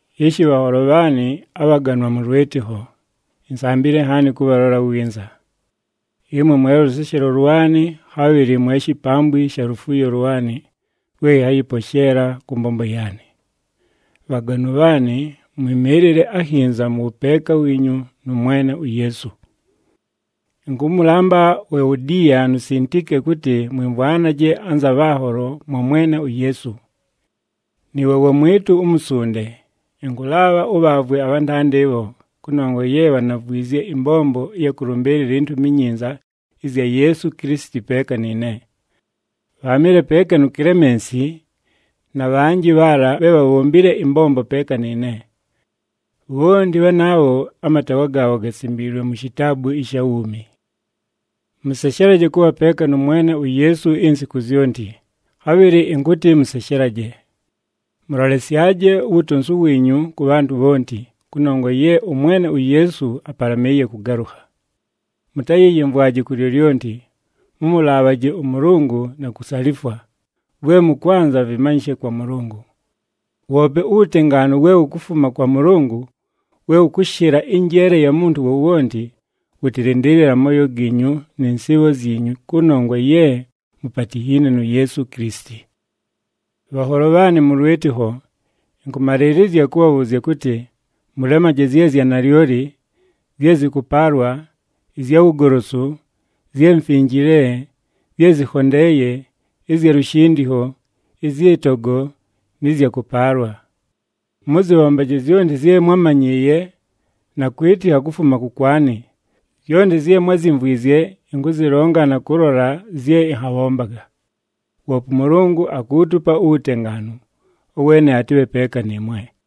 Ishi bhanholo bhaanɨ abhaganwa mʉ lwɨtɨkho, insambile nhaani kʉbhalola winza. Ɨmwe mwe lʉseshelo lwanɨ, khabhɨlɨ mwe shipambwi sha lufuuyo lwanɨ lwe ɨnhayɨposheela kʉ mbombo yaanɨ. Bhaganwa bhaanɨ, mwɨmɨɨlɨle akhinza mʉ wʉpeeka wiinyu nʉ Mwene uYeesu. Ɨnkʉmʉlamba uEwodiya nu Sintike kʉtɨ mwɨmvwanaje anza bhanholo mwa Mwene uYeesu. Nɨɨwe wamwɨtʉ umusunde, ɨnkʉlaabha ʉbhaavwe abhantanda ɨbho, kʉnongwa ye bhanavwizye ɨmbombo ɨya kʉlʉmbɨɨlɨla iNtumi iNyinza ɨzya Yeesu Kilisiti peeka nɨɨne. Bhaamɨle peeka nu Kilemensi, na bhanjɨ bhaala bhe bhabhombile ɨmbombo peeka nɨɨne. Bhonti bhanaabho amataawa gaabho gasimbiilwe mu shitaabu ɨsha wuumi. Mʉseshelaje kʉbha peeka nʉ Mwene uYeesu insiku zyonti, khabhɨlɨ ɨnkʉtɨ mʉseshelaje! Mʉlolesyaje uwutonsu wiinyu kʉ bhantʉ bhonti, kʉnongwa ye ʉMwene uYeesu apalamɨɨye kʉgalʉkha. Mʉtayɨyɨmvwaje ku lyolyonti, mʉmʉlaabhaje ʉMʉlʉngʉ na kusalifwa, vwe mʉkwanza vɨmanyɨshe kwa Mʉlʉngʉ. Woope uwutengaanu we wukufuma kwa Mʉlʉngʉ we wʉkʉshɨla ɨnjeele ya muntu wowonti, wʉtɨlɨndɨɨlɨle amooyo giinyu nɨ nsɨɨbho zyinyu kʉnongwa ye mupatinhiine nu Yeesu Kilisiti. Bhanholo bhaanɨ mʉ lwɨtɨkho, ɨnkʉmalɨɨlɨzya kʉbhabhʉʉzya kʉtɨ, mʉlemaje zye zya nalyoli, zye zɨkʉpaalwa, ɨzya wugolosu, zye mfinjile, zye zɨkhondeeye, ɨzya lushindikho, ɨzyɨ togo, nɨ zya kʉpaalwa. Mʉzɨbhombaje zyonti zye mwámanyɨɨye na kwɨtɨkha kufuma kʉkwanɨ, zyonti zye mwázyimvwizye ɨnkʉzɨlonga na kʉlola zye ɨnhabhombaga. Woope ʉMʉlʉngʉ akuutupa uwutengaanu. Ʉweene atɨbhe peeka nɨɨmwe.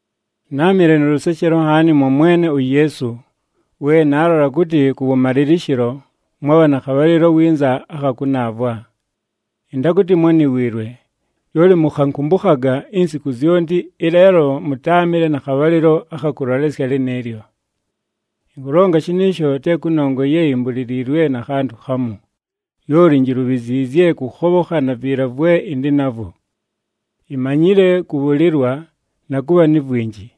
Náamɨle nʉ lʉseshelo nhaani mwa Mwene uYeesu, we naalola kʉtɨ kʉwʉmalɨlɨshɨlo, mwabha na khabhalɨlo winza akha kʉnaavwa. Ɨntakʉtɨ mwániwiilwe, lyoli mʉkhankʉmbʉkhaga insiku zyonti, ɨleelo mʉtáamɨle na khabhalɨlo akha kʉlolesya lɨnɨɨlyo. Ɨnkʉlonga shɨnɨɨsho te kʉnongwa ye imbuliliilwe na khantʉ khamu, lyoli injilubhiziizye kʉkhobhokha na viila vwe ɨndɨ navwo. Imanyile kʉbhʉlɨlwa, na kʉbha ni vwinji.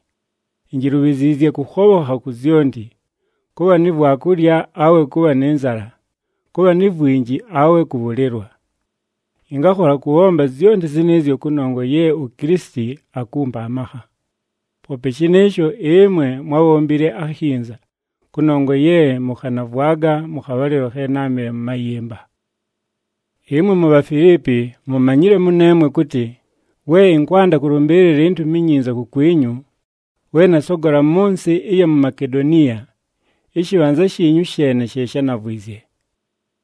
Injilubhiziizye kʉkhobhokha ku zyonti, kʉbha ni vwakulya awe kʉbha nɨ nzala, kʉbha ni vwinji awe kʉbhʉlɨlwa. Ɨngakhola kʉbhomba zyonti zɨnɨɨzyo kʉnongwa ye uKilisiti akumpa amakha. Poope shɨnɨɨsho, ɨmwe mwábhombile akhinza, kʉnongwa ye mʉkhanavwaga mʉ khabhalɨlo khe náamɨle mʉ mayɨmba. Ɨmwe muBhafiliipi mumanyile mʉneemwe kʉtɨ we ɨnkwanda kʉlʉmbɨɨlɨla iNtumi iNyinza kukwinyu, we nasogola mʉ nsɨ ɨya mu Makedoniya, ɨshɨbhanza shiinyu sheene she shánavwizye.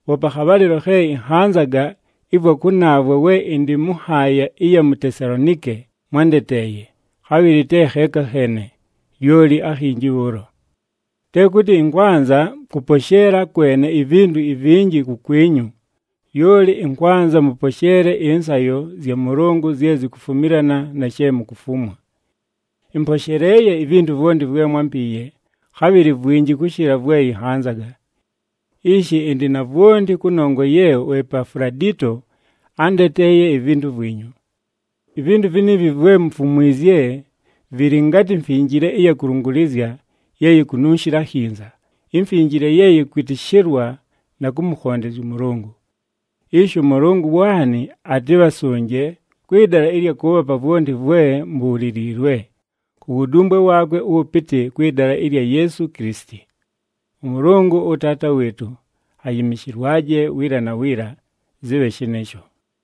Poope akhabhalɨlo khe ɨnhanzaga ɨvwa kʉnaavwa we ɨndɨ mʉ nhaaya ɨya mu Tesalonike mwándeteeye, khabhɨlɨ te kheeka kheene, lyoli akhinji bhʉʉlo. Te kʉtɨ ɨnkwanza kʉposheela kwene ivintu ivinji kukwinyu, lyoli ɨnkwanza mʉposheele ɨnsayo zya Mʉlʉngʉ zye zikufumilana na she mukufumwa. Ɨmposheleeye ivintu vwonti vwe mwámpiiye, khabhɨlɨ vwinji kʉshɨla vwe ɨnhanzaga. Ishi ɨndɨ na vwonti kʉnongwa ye uEpafuladito ándeteeye ivintu vwinyu. Ivintu viniivi vwe mufumwizye, vɨlɨ ngatɨ mfinjile ɨya kʉlʉngʉlɨzya ye yikununshila akhinza, imfinjile ye yɨkwɨtɨshɨlwa na kʉmʉkhondezya ʉMʉlʉngʉ. Ishi ʉMʉlʉngʉ waanɨ atɨbhasʉnje kwɨ dala ɨlya kʉʉbhapa vwonti vwe mubhuliliilwe, ku wudumbwe waakwe ʉwʉpɨtɨ kwɨ dala ɨlya Yeesu Kilisiti. ɄMʉlʉngʉ, ʉTaata wɨɨtʉ, ayɨmɨshɨlwaje, wiila na wiila! Zɨbhe shɨnɨɨsho.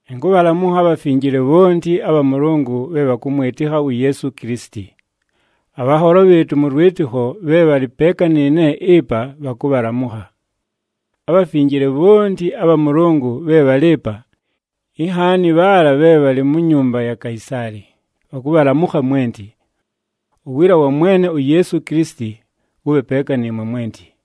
Ɨnkʉbhalamʉkha abhafinjile bhonti abha Mʉlʉngʉ bhe bhakʉmwɨtɨkha uYeesu Kilisiti. Abhanholo bhɨɨtʉ mʉ lwɨtɨkho bhe bhalɨ peeka nɨɨne ɨpa bhakʉbhalamʉkha. Abhafinjile bhonti abha Mʉlʉngʉ bhe bhalɨ ɨpa, inhaani bhaala bhe bhalɨ mu nyumba ya Kaisaali, bhakʉbhalamʉkha mwenti. Uwiila wa Mwene uYeesu Kilisiti wʉbhe peeka nɨɨmwe mwenti.